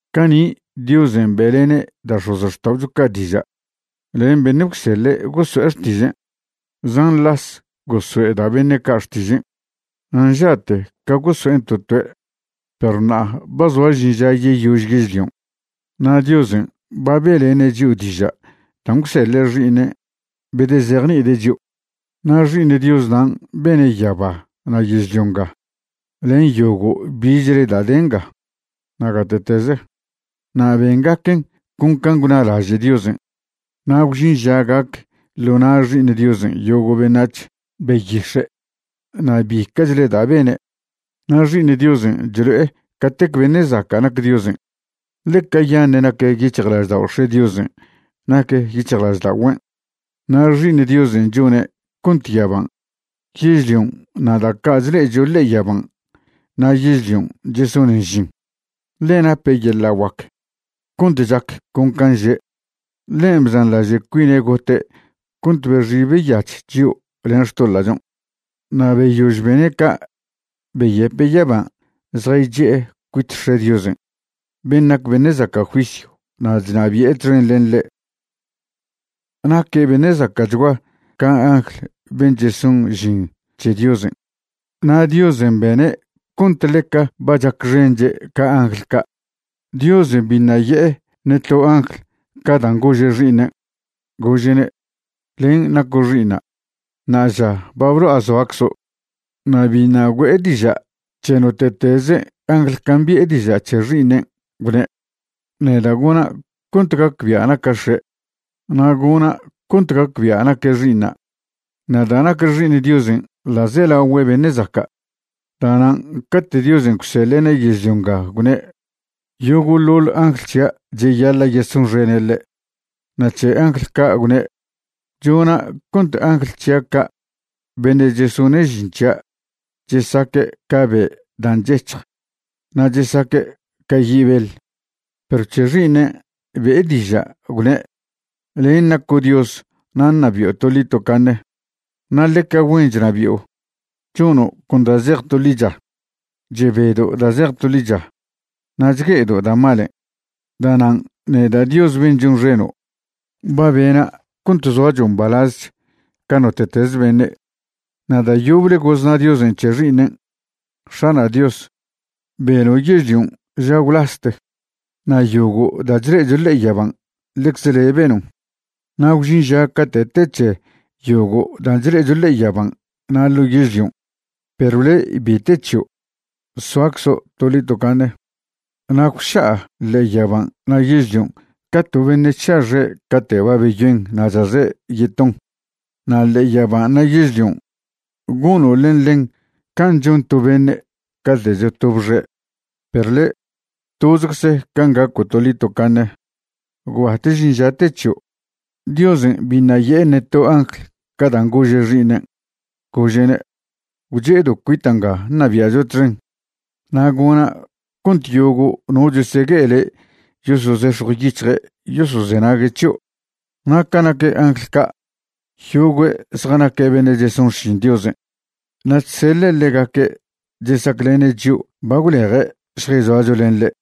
Cani' Diosen' be'lene' da' x̱ozxta'ocho ca' diža' len beṉe' gwseḻe' goso'e xtižen'. Zan las gosoe' da' beṉe' ca' xtižen' na' nža'te ca goso'en to toe'. Perw ṉa'a ba zoa žin ža yeyož yežlion' na' Diosen' ba be'lene' chio' diža' dan' gwseḻe' Xi'iṉen' bedezejni'ide' chio'. Na' Xi'iṉ Dios nan' bene' yaba na' yežlio nga len yogo' bichle da' de nga na' gate'teze. Na' bengaquen' con can' gwnalaže' Diosen'. Na' gwžin ža gac ḻo na' Xi'iṉ Diosen' yogo' beṉac̱h, beyix̱e', na' bica'chle da' bene'. Na' Xi'iṉ Diosen' chlo'e catec beṉe' zaca' nac Diosen', ḻe cayaṉe' nac yic̱hjlaždao' X̱e' Diosen' nac yic̱hjlažda'ogüen'. Na' Xi'iṉ Diosen' chone' cont yaban', yežlion' na' da' ca' chle'echo ḻe'e yaban' na' yežlion' chesonen žin, ḻe nape' yeḻa' guac cont chac con can' že'. Ḻen' bzanḻaže' cuine' gote' cont bexi beyach chio' len xtoḻa'chon'. Na' beyož bene' ca' beyepe' yaban' zjaychi'e cuit X̱e' Diosen' ben' nac beṉe' zaca' juisyw na' chnabi'e txen len ḻe'. Naque' beṉe' zaca'chgua ca angl ben' cheson žin c̱he Diosen', na' Diosen' bene' cont ḻeca ba chacxenche' ca angl ca'. Diosen' biṉa' ye'e ṉe to angl ca dan' gože' Xi'iṉen', gože'ne': Len' naco' Xi'iṉa'; ṉa'aža ba blo'a zoaczo'. Na' biṉa' güe'e diža' c̱he note'teze angl can' bi'e diža' c̱he Xi'iṉen', gwne': Neda' gona' cont gacbia' naca' X̱e', na' gona' cont gacbia' naque' Xi'iṉa'. Na' da' nac Xi'iṉ Diosen' ḻa'zelagüe beṉe' zaca', da'nan' cate' Diosen' gwseḻe'ne' yežlio nga gwne': Yogo'ḻoḻ angl c̱hia' cheyaḻa' yesonxene' ḻe'. Na' c̱he angl ca' gwne': Chona' cont angl c̱hia' ca' beṉe' chesone' žin c̱hia' chesaque' ca be' dan' chec̱hj na' chesaque' ca yi' beḻ. Perw c̱he Xi'iṉen' be'e diža', gwne': Len' naco' Dios na' ṉabi'o toḻi tocaṉe. Na' ḻeca güen chnabi'o, chono' con da' zej to ḻicha. Chebedo' da' zej to ḻicha na' chgue'edo' da' malen'. Da'nan' neda' Dios ben' chonxeno' ba bena' cont zoacho' mbalazech ca note'teze beṉe'. Na' da' yoble gozna Diosen' c̱he Xi'iṉen': X̱ana' Dios, beno' yežlion' ža gwlaste, na' yogo' da' chle'echo ḻe'e yaban' ḻecze le' benon'. Na' gwžin ža cate' te c̱he yogo' dan' chle'echo ḻe'e yaban' na' ḻo yežlion', perw le' bi te c̱hio'; soaczo' toḻi tocaṉe. Na' gwša'a ḻe'e yaban' na' yežlion' ca to beṉe' chša' xe' cate' ba beyoen na' chaze' yeton. Na' ḻe'e yaban' na' yežlion', gono' len ḻen can' chon to beṉe' cate' chotob xe'. Perw le', tozecze can' gaco' toḻi tocaṉe, gwbat žin ža te c̱hio'. Diosen' biṉa' ye'e ṉe to angl ca dan' gože' Xi'iṉen', gože'ne': Gwche'edo' cuita' nga ṉabia'cho txen, na' gona' cont yogo' no chesegue'e le' yosozex̱jw yic̱hje' yosozenague' c̱hio'. Na' ca nac angl ca', yogue' zjanaque' beṉe' cheson xšin Diosen', na' chseḻe' ḻegaque' chesaclene' chio' ba gwleje' šjayzoacho len ḻe'.